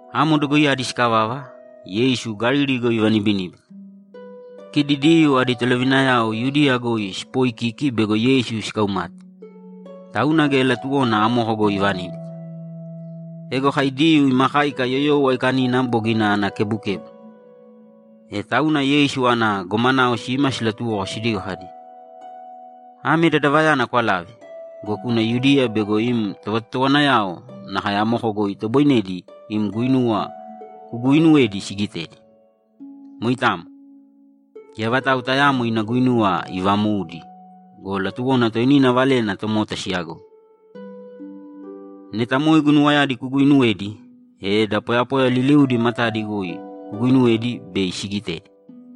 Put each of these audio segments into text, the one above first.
Amo dogoiyadi sikavava, Yeisu Galili goi ivanibiníbita. Kidi Diyuu adi tolovinayao Yudiya goi siipoikiki bego Yeisu sikaumate, tauna geya latuwona amoko goi ivaníbita. Ego kai Diyuu ima káika Yoyou Aikanina bogina ana kebukebu. E tauna Yeisu ana gomanao sima silatuwoko sidigo kadi, ‘Ame dadavayana kwalāve go, kūna Yudiya bego im tovatotowanayao nakae amoko goi itoboinedi im guinuwa kuguuinuwedi sigitedi. Moitamo. Geya vatau tayaamo ina guinuwa ivamoudi go, latuwona toinina valena tomota siyagoi. Neta moe guinuwayadi kuguuinuwedi, e da poyapoya liliudi matadi goi kuguinuwēdi bei sigitedi.’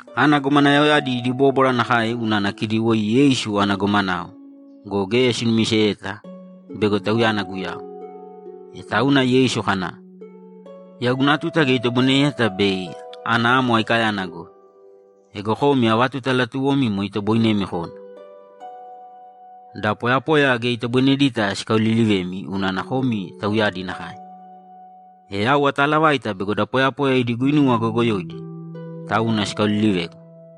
Ana gomanaoyadi idi bóbwara nakae unana kidi woi Yeisu ana gomanao go, geya sinumiseyeta bego Tauyana Guyau. E tauna Yeisu kana, ‘Yau guna tuta geya itoboineyeta bei ana amo aikayana goi. Ego komi ava tuta latuwomi moe itoboinemi kona. Da poyapoya geya itoboinedita sikaolilivemi unana komi tauyadi nakae. E yau ataalavaita bego da poyapoya idi guinuwa goyogoyoidi, tauna sikaolilivegu.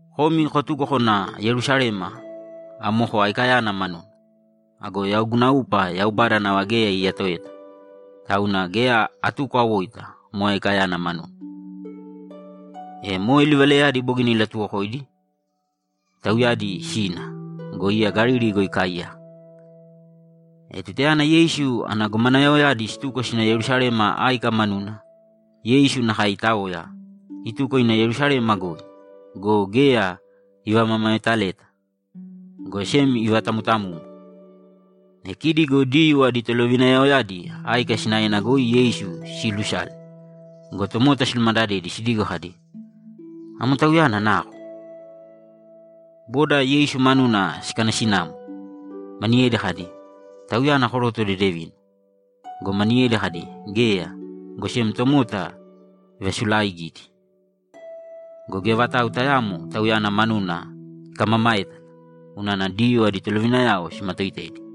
Komi kotūko kōna Yerusalema amo aikayana manuna. Ago yau guna upa Yaubada nava geya iyatoeta, tauna geya atuko awoita moe aikayana manuna.’ E moe livalayadi bogina ilatuwokoidi, tauyadi sina go, iya Galili goi ikaaiyaka. E tutayana Yeisu ana gomanaoyadi situko sina Yerusalema áika manuna, Yeisu nakae itaoya, ituko ina Yerusalema goi go, geya ivamamaetaleta, go sem ivatamtamumu. E kidi go Diyuu adi tolovinayaoyadi áika sinaena goi Yeisu siilusale go, tomota silumadadedi sidigo kadi, ‘Amo Tauyana nako?’ Boda Yeisu manuna sikanasinamo. Maniyedi kadi, ‘Tauyana koroto dedevina.’ Go maniyedi kadi, ‘Geya, go sem tomota ivasulaaigidi.’ Go geya vatau tayaamo Tauyana manuna ikamamaétala, unana Diyuu adi tolovinayao simatooitedi.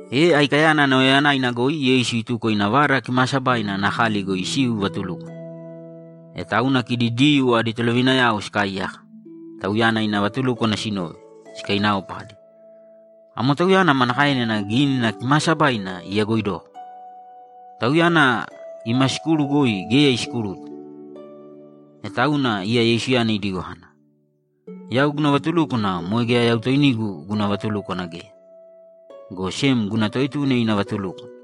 E aikayana nauyayanaina goi Yeisu ituko ina Vada Kimaasabaina ana kali goi isiu ivaatulúkwana. E tauna kidi Diyuu adi tolovinayao sikaaiyaka, Tauyana ina vatulúkwana sinove, sikainaopa kadi, ‘Amo Tauyana manakaena Gínina Kimaasabaina iyagoidoko? Tauyana ima sikuru goi geya isikuruta.’ E tauna iya Yeisuyana idigo kana, ‘Yau guna vatulúkwana moe geya yau toinigu guna vatulúkwana geya, go sem guna Toetuna ina vatulúkwana.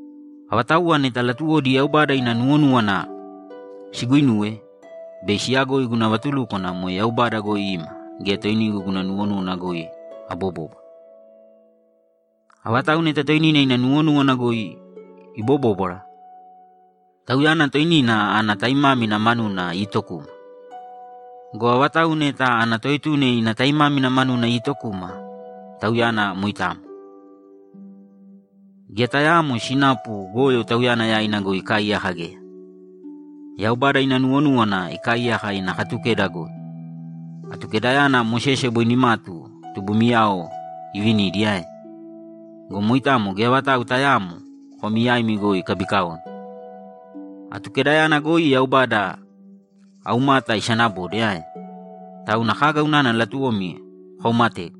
Avatauwa neta latuwodi Yaubada ina nuwonúwana siguinuwe, bei siyagoi guna vatulúkwana moe Yaubada goi ima gea toinigu guna nuwonúwana goi abobóbwara. Avatau neta toinina ina nuwonúwana goi ibobóbwara, tauyana toinina ana taimámina manuna iitokuma. Go avatau neta ana toetuna ina taimámina manuna iitokuma, tauyana moitamo. Geya tayaamo sinapu goyo tauyana yaina goi ikaaiyaka geya. Yaubada ina nuwonúwana ikaaiyaka ina Katukeda goi. Atukedayana Mosese boi nimatu tubumiyao ivinidi ae? Go moitamo geya vatau tayaamo komi yaimi goi ikabikaone. Atukedayana goi Yaubada aumata isanabode ae? Tauna kaga unana latuwomi kokaumategu?’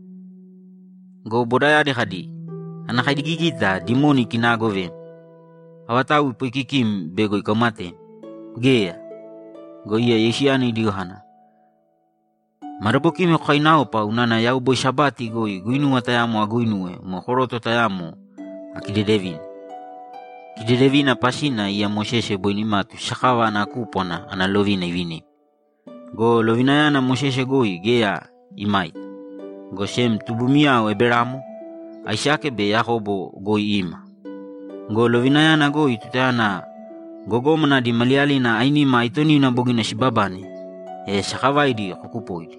Go bodayadi kadi, ‘Ana kaigigita dimoni ikinaagovem. Avatau ipooikikim bego ikaumatem? Geya!’ Go iya Yeisuyana idigo kana, ‘Madabokimi kokainaopa unana yau boi Sabati goi guinuwa tayamo aguinuwe moe koroto tayamo akidedevine. Kidedevina pasina iya Mosese boi nimatu sakava ana kúpwana ana lovina ivinimi. Go lovinayana Mosese goi geya imaita, go sem tubumiyao Eberamo, Aisake be Yakobo goi ima. Go lovinayana goi tutayana gogómana adi maliyalina ainima aitonina bogina sibabane, e sakavaidi kokupoidi.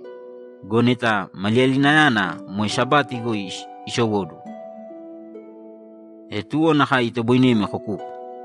Go neta maliyalinayana moe Sabati goi isowóduwo, e tuwo nakae itoboinemi kokupo.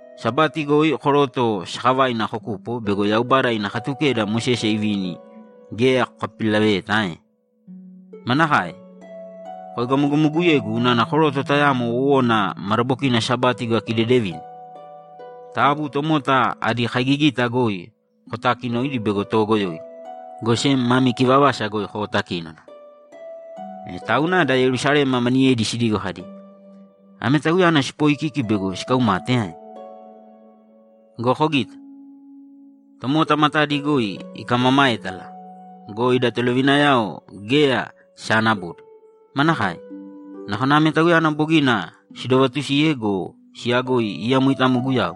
Sabati goi koroto sakavaina kokupo bego Yaubada ina Katukeda Mosese ivini geya kokapipilaveyeta ae? Manakae? Koegamogamoguyegu unana koroto tayamo wowona madabokina Sabati goi akidedevine? Taabu tomota adi kaigigita goi kotaakinōidi bego toogoyoidi, go sem mami kivavasa goi kootakīnona.’ E tauna da Yerusalema maniyedi sidigo kadi, ‘Ame Tauyana siipoikiki bego sikaumate ae? Go kogīta. Tomota matadi goi ikamamaétala go, ida tolovinayao geya sisaanabode. Manakae? Nakona ame Tauyana bogina sidovatusiye go, siyagoi iya moitamo Guyau,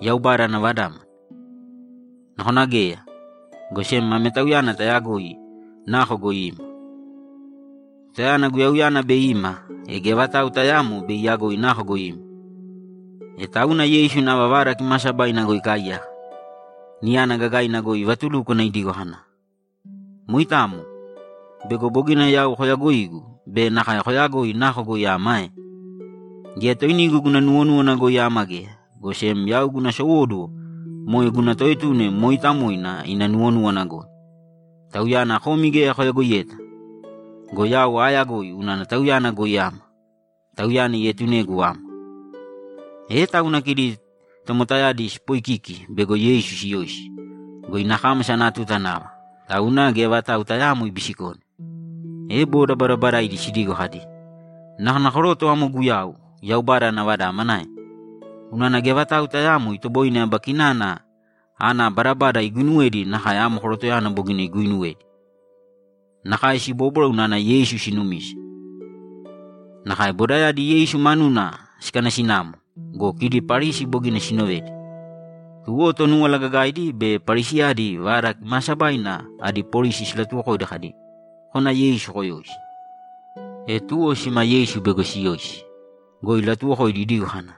Yaubada ana Vadámana? Nakona geya, go sem ame Tauyana tayagoi nako goi ima. Tutayana Guyauyana bei ima, e geya vatau tayaamo bei iyagoi nako goi ima.’ E tauna Yeisu nava Vada Kimaasabaina goi ikaaiyaka, niyana gagaina goi ivatulúkwana idigo kana, ‘Moitamo? Bego bogina yau koyagoigu be nakae koyagoi nako goi ama ae? Geya toinigu guna nuwonúwana goi ama geya, go sem yau guna sowóduwo moe guna Toetuna mooitamoina ina nuwonúwana goi. Tauyana komi geya koyagoiyeta go, yau aayagoi unana Tauyana goi ama. Tauyana ietunegu ama.’ E tauna kidi tomotayadi siipoikiki bego Yeisu siyoisi go, ina kámasa ana tuta nava, tauna geya vatau tayaamo ibisikone. E boda badabadaidi sidigo kadi, ‘Nakona koroto amo Guyau, Yaubada ana Vadámana ae? Unana geya vatau tayaamo itoboine aba kinana ana badabada iguinuwedi nakae amo korotoyana bogina iguuinuwedi!’ Nakae sibóbwara unana Yeisu sinumise. Nakae bodayadi Yeisu manuna sikanasinamo go, kidi Parisi bogina sinovedi. Tuwo Tonúwala Gagaidi be Parisiyadi Vada Kimaasabaina adi polisi silatuwokoidi kadi, ‘Kōna Yeisu koyōisi.’ E tuwo sima Yeisu bego siyoisi go, ilatuwokoidi idigo kana,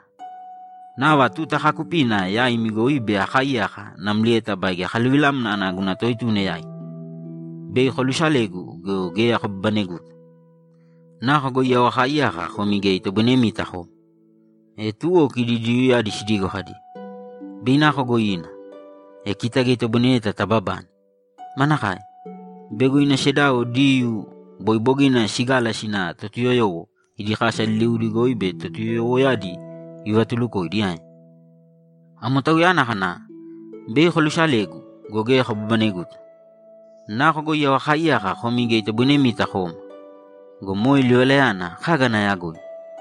‘Nava tuta kaakupina yaimi goi bei akaaiyaka namlieta baige akaluvilamna ana guna Toetuna yaina. Bei kolusalegu go, geya kobabaneguta. Nako goi yau akaaiyaka komi geya itoboinemita koma.’ E tuwo kidi Diyuuyadi sidigo kadi, ‘Bei nako goi ina, e kita geya itoboinedeta tababane? Manakae? Bego ina sedao Diyuu boi bogina sigala sina Totuyoyowo idi kasa liliudi goi be Totuyoyowoyadi ivatulukoidi ae? Amo tauyana kana, “Bei kolusalegu go, geya kobabaneguta. Nako goi yau akaaiyaka komi geya itoboinemita koma.” Go moe livalayana kaga ana yagoina?’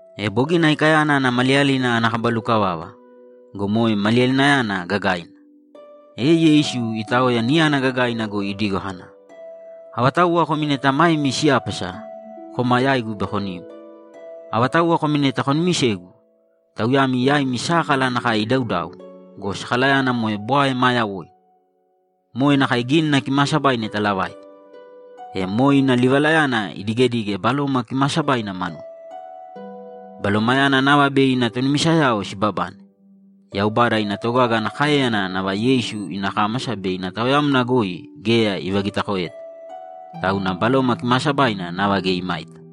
E bogina aikayana ana maliyalina ana kaba lukavava go, moe maliyalinayana gagaina, e Yeisu itaoya niyana gagaina goi idigo kana, ‘Avatauwa komi neta maemi siyápasa, kōma yaigu bei konim. Avatauwa komi neta konumisegu, tauyami yaimi sákala nakae idaudau go, sakalayana moe bwae maa yawoina. Moe nakae Gínina Kimaasabaina italavaita.’ E moe ina livalayana idigedige Baloma Kimaasabaina manuna. Balomayana nava bei ana tonumisayao sibabane. Yaubada ina togaga ana káeyana nava Yeisu ina kámasa be ina taoyamna goi geya ivagitakoeta, tauna Baloma Kimaasabaina nava geya imaita.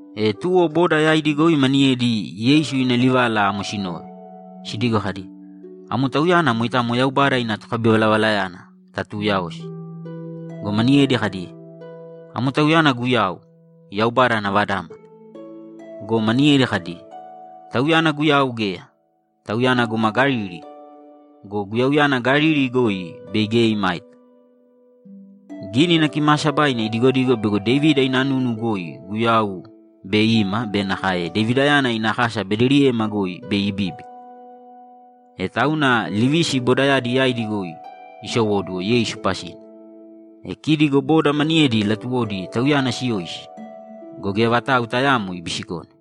E tuwo boda yaidi goi maniyedi Yeisu ina livala amo sinove, sidigo kadi, ‘Amo Tauyana moitamo Yaubada ina tokabivalavalayana tatuuyaosi.’ Go maniyedi kadi, ‘Amo tauyana Guyau, Yaubada ana Vadámana!’ Go maniyedi kadi, ‘Tauyana Guyau geya. Tauyana guma Galili go, Guyauyana Galili goi bei geya imaita. Gínina Kimaasabaina idigodigo bego Devida ina nunu goi Guyau bei ima be nakae Devidayana ina kasa Bedeliyema goi bei ibíbina.’ E tauna livisi bodayadi yaidi goi isowóduwo Yeisu pasina. E kidi go boda maniyedi latuwodi Tauyana siyoisi go, geya vatau tayaamo ibisikone.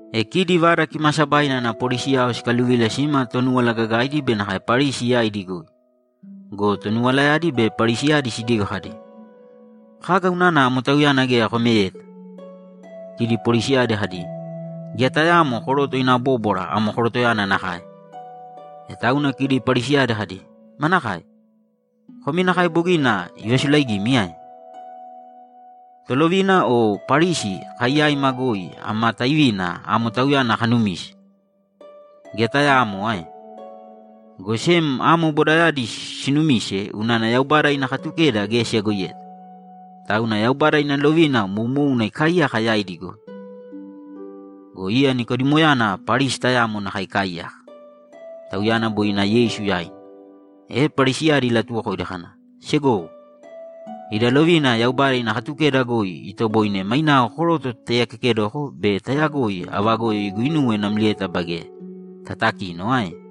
E kidi Vada Kimaasabaina ana polisiyao sikaluvila sima Tonúwala Gagaidi be nakae Parisi yaidi goi. Go tonuwalayadi be Parisiyadi sidigo kadi, ‘Kaga unana amo Tauyana geya komeyeta?’ Kidi polisiyadi kadi, ‘Geya tayaamo koroto ina bóbwara amo korotoyana nakae!’ E tauna kidi Parisiyadi kadi, ‘Manakae? Komi nakae bogina ivasulaigimi ae? Tolovina o Parisi kai yaima goi ama taivina amo Tauyana kanumise? Geya tayaamo ae? Go sem amo bodayadi sinumise unana Yaubada ina Katukeda geya siyagoiyeta. Tauna Yaubada ina lovina moumouna ikaaiyaka yaidi goi.’ Go iya Nikodimoyana Parisi tayamo nakae ikaaiyaka. Tauyana boi ina Yeisu yaina. E Parisiyadi ilatuwokoidi kana, ‘Segowo, ida lovina Yaubada ina Katukeda goi itoboine mainao koroto tataiyakekedoko be tayagoi ava goyo iguinuwe namlieta baige tatakino ae?’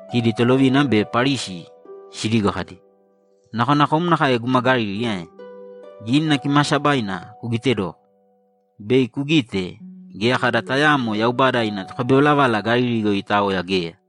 Kidi tolovina be Parisi sidigo kadi, ‘Nakona kom nakae guma Galili ae? Gínina Kimaasabaina kugitedōko, bei kugite geya kada tayaamo Yaubada ina tokabivalavala Galili goi itaoya geya!’ [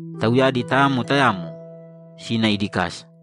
Tauyadi tayamo tayamo sina idi kasa.